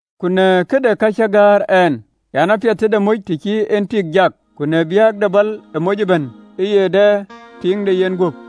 Ku në këde ka cäk gäär ɛn an: Apiɛth tëde moc të cïï en tik jak. Ku në biäk de bal, ë moc ëbɛ̈n ë ye dɛ tiiŋ de yenguöp.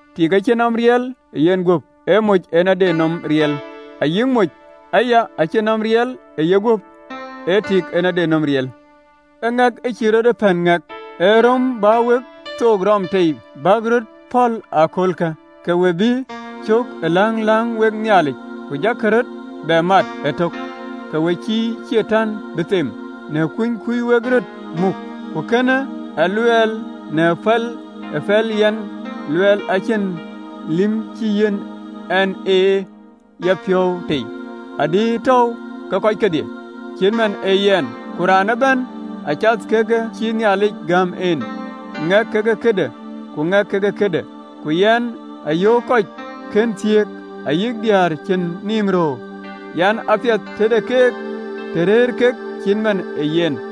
Tik acïn nɔm riɛl ë yenguöp, ee moc en ade nɔm riɛl: ayï moc aya, acïn nɔm riɛl ë yeguöp, ee tik en ade nɔm riɛl. Ë ŋɛk cïï rɔt ee pɛ̈n ŋɛk, ë röm bä wek thook röm tei bäk röt pɔ̈l ë aköölkë, ke we bï cök ë läŋ läŋ wek Nhialic, ku jakï röt bɛ mat ëtök, ke we cïï Catan bï them, në kuny kuöc wek röt muk. Ku kënë a luɛɛl në päl ë pɛ̈lë yɛn luɛɛl, acïn liem cï yiɛ̈n ɛn. Ë yapiɔ̈u tei adï tɔ̈u kɔc kedhie cït man ë yɛn. Ku raan ëbɛ̈n acath ke kë cï Nhialic gäm en, ŋɛk ke këde, ku ŋɛk ke këde. Ku yɛn yöök kɔc kën thiëëk, ayï diëër cïn nïïm röör an, Apiɛth tëde keek të rëër kek cït man ë yɛn.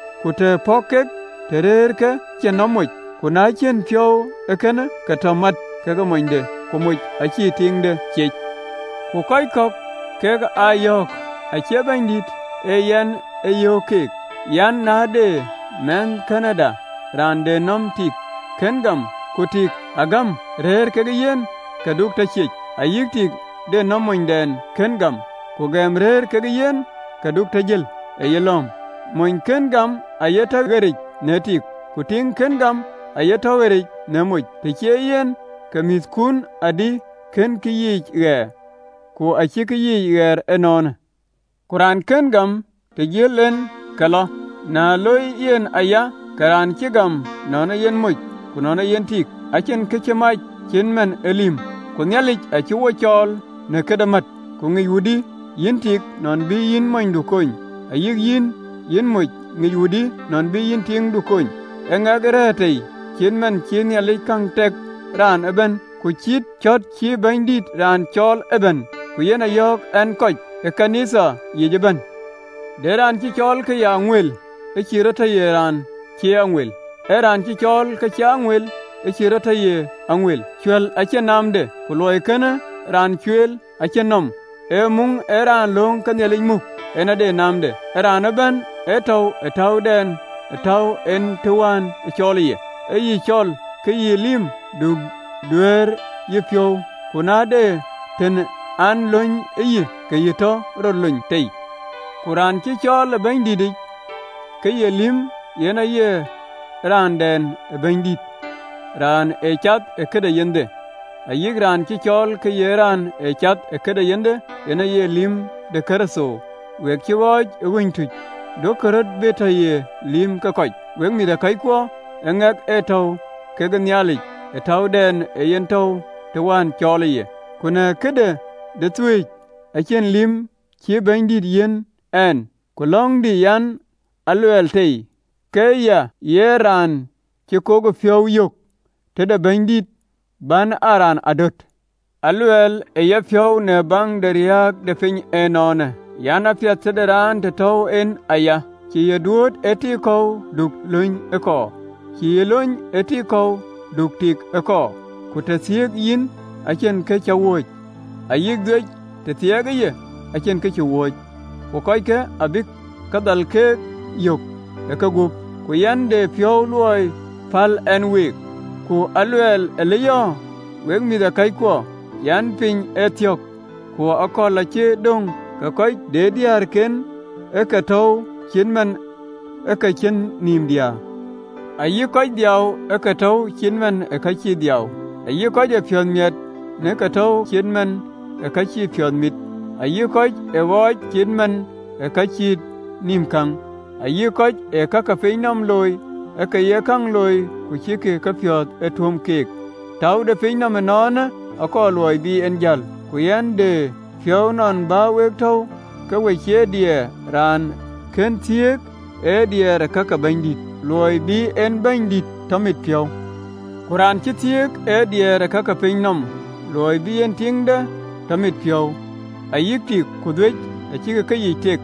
(ku të pɔ̈k kek, tɔ rɛ̈ɛ̈r ke cïn nɔm moc, ku na cïn piɔ̈u ee kënë, ke tɔ mät kekë monyde), ku moc, ë cïï tiiŋde ciec. Ku kɔc kɔ̈k kek a yɔ̈ɔ̈k, acie Bɛ̈nydït, ee yɛn ë yöök keek an: Na de mɛnhkënëda, raan de nɔm tiiŋ kën gam, ku tik agam rëër kekë yen, ke du tɔ cieec. Ayï tiiŋ de monydɛn kën gam, ku gɛm rëër kekë yen, ke du tɔ jël ë yelɔ̈ɔ̈m. Mony kën gam aye tɔ ɣeric në tik, ku tiiŋ kën gam aye tɔ ɣeric në moc: tëë cie yen, ke mïthkun adï kënkï yiic ɣɛɛr, ku acïk yiic ɣɛɛr ënɔɔnë. Ku raan kën gam, të jël en, ke lɔ: na loi yen aya, ke raan cï gam, nɔn ee yen moc ku nɔn ee yen tik, acïn kë cï e mac, cït man ë lïm: ku Nhialic acï wo cɔɔl në këde mät. Ku ŋic wudï, yïn tik, nɔn bï yïn monydu kony? Ayï yïn, yïn moc, ŋic wudï nɔn bï yïn tiiŋdu kony? Ë ŋɛk ë rɛ̈ɛ̈r tei, cït man cï Nhialic käŋ tɛ̈k raan ëbɛ̈n, ku cït cɔ̈t cï Bɛ̈nydït raan cɔɔl ëbɛ̈n. Ku yen a yɔ̈ɔ̈k ɛn kɔc ë ɣööt ke Nhialic yiic ëbɛ̈n. De raan cï cɔɔl ke ye aŋuɛl? Ë cïï rɔt tɔ ye raan cie aŋuɛl. Ee raan cï cɔɔl ke cie aŋuɛl? Ë cïï rɔt tɔ ye aŋuɛl. Cuɛ̈l acïn naamde, ku luɔi kënë raan cueel acïn nɔm, ee muŋ ë raan lööŋ ke Nhialic muk, en ade naamde. Ë raan ëbɛ̈n ë tɔ̈u ë täudɛn ë tɔ̈u en të wään cɔɔlë ye. Ë yï cɔl, ke yï ë lïm? Du diɛɛr ë yïpiɔ̈u: ku na de tën an, lony yï, ke yï tɔ rɔt lony tei. Ku raan cï cɔɔl ë Bɛ̈nydïtic, ke ye lïm, yen aye raanden ë Bɛ̈nydït raan ee cath ë këde yenhde: ayï raan cï cɔɔl ke ye raan ee cath ë këde yenhde, yen aye lïm de Kërtho. We cï ɣɔɔc ë ɣööc tuc, duökï röt bï tɔ ye lïïm ke kɔc. Wek mïthëkɔckuɔ, ë ŋɛk ë tɔ̈u kekë Nhialic ë täudɛn ë yen tɔ̈u të wään cɔɔlë ye. Ku na këde dhueec, acïn liem cïï Bɛ̈nydït yiɛ̈n ɛn: ku löŋdï yen a luɛɛl tei, ke ya ye raan cï kokëpiɔ̈u yök tëde Bɛ̈nydït, bän aa raan adöt. Aluɛɛl ë yapiɔ̈u, në baŋ de riääk de piny ënɔɔnë an: Apiɛth të de raan të tɔ̈u en aya. Cï yï duööt ë tik kɔ̈u? Du luny ee kɔɔr. Cï yï lony ë tik kɔ̈u? Du tik ee kɔɔr. Ku të thiëëk yïn, acïn kërɛɛc cï wööc, ayï dhuec, të thiɛɛkë ye, acïn kërɛɛc cï wööc. Ku kɔckë abïk kë dhal keek yök ë kegup: ku yɛn de piɔ̈u luɔi päl ɛn week. Ku aluɛɛl alëyɔ̈ɔ̈, wek mïthëkɔckuɔ an, piny athiɔ̈k, ku ë akööl cï döŋ, ke kɔc de diëërken ë ke tɔ̈u cït man ë ka cïn nïïm diäär, ayï kɔc ë dhiau, ë ke tɔ̈u cït man ë ka cïï dhiau, ayï kɔc ë piɔ̈ɔ̈th miɛt, ë ke tɔ̈u cït man ë ka cïï piɔ̈ɔ̈th mit, ayï kɔc ë ɣööc, cït man ë ka cïn nïïm käŋ, ayï kɔc ë ka ke pinyë nɔm looi, ë ke ye käŋ looi ku cïkï kepiɔ̈ɔ̈th tum keek: täu de piny nɔm ënɔɔnë akɔɔr luɔi bï en jäl. Ku yɛn de piɔ̈u nɔn bä wek tɔ̈u ke we cie diɛɛr. Raan kën thiëëk ee diɛɛr ë ka ke Bɛ̈nydït, luɔi bï en Bɛ̈nydït tɔ mit piɔ̈u: ku raan cï thiëëk ee diɛɛr ë ka ke piny nɔm, luɔi bï en tiiŋde tɔ mit piɔ̈u. Ayï tik ku dhuec acïk keyiic tek.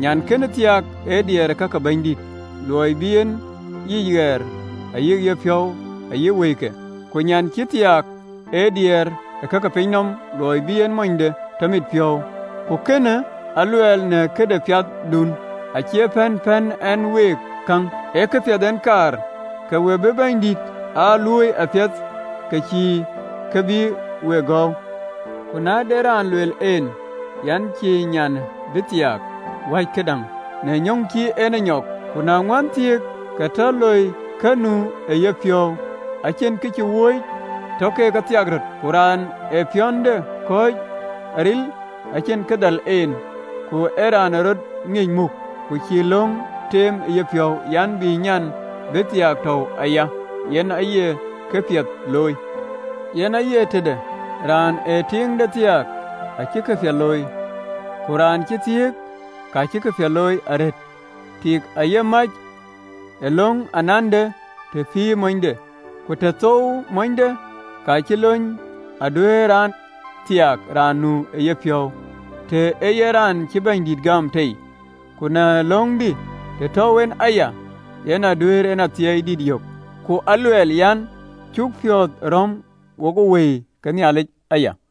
Nyan kënë thiaak ee diɛɛr ë ka ke Bɛ̈nydït, luɔi bï en yic ɣɛɛr ayï yepiɔ̈u ayï wëike: ku nyan cï thiaak ee diɛɛr ë ka ke piny nɔm, luɔi bï en monyde tɔ mit piɔ̈u. Ku kënë aluɛɛl në këde piathdun, acie pɛ̈n pɛ̈n ɛn week käŋ, ee këpiɛth en kaar, ke we bï Bɛ̈nydït aa luööi apiɛth, ke cïn kë bï week gɔ̈ɔ̈u. Ku na de raan luel en an: cï nyan bï thiaak wäc këdäŋ, në nyɔk cï en nyɔk, ku na ŋuän thiëëk, ke tɔ loi kë nu ë yepiɔ̈u, acïn kërɛɛc cï wööc, tɔ ke thiak röt. Ku raan ë ye piɔ̈nde kɔ̈ɔ̈c aril, acïn kë dhal en, ku ee raan ë rɔt ŋiëc muk, ku cï löŋ teem ë yepiɔ̈u, an, bï nyan bï thiaak tɔ̈u aya, yen aye këpiɛth looi. Yen aye tëde, raan ë tiiŋde thiaak acï këpiɛth looi, ku raan cïï thiëk, ka cï këpiɛth looi arëët. Tik aye mac ë löŋ anande të pïïrë monyde, ku të thouwë monyde, ka cï lony, aduëërë raan thiaak raan nu ë yepiɔ̈u, të ee yen raan cï Bɛ̈nydït gam tei. Ku në löŋdï, të tɔ̈u en aya, yen aduëër en athiɛɛi dït yök: ku aluɛɛl, an, cuk piɔ̈ɔ̈th rɔ̈m wokë Wëi ke Nhialic aya.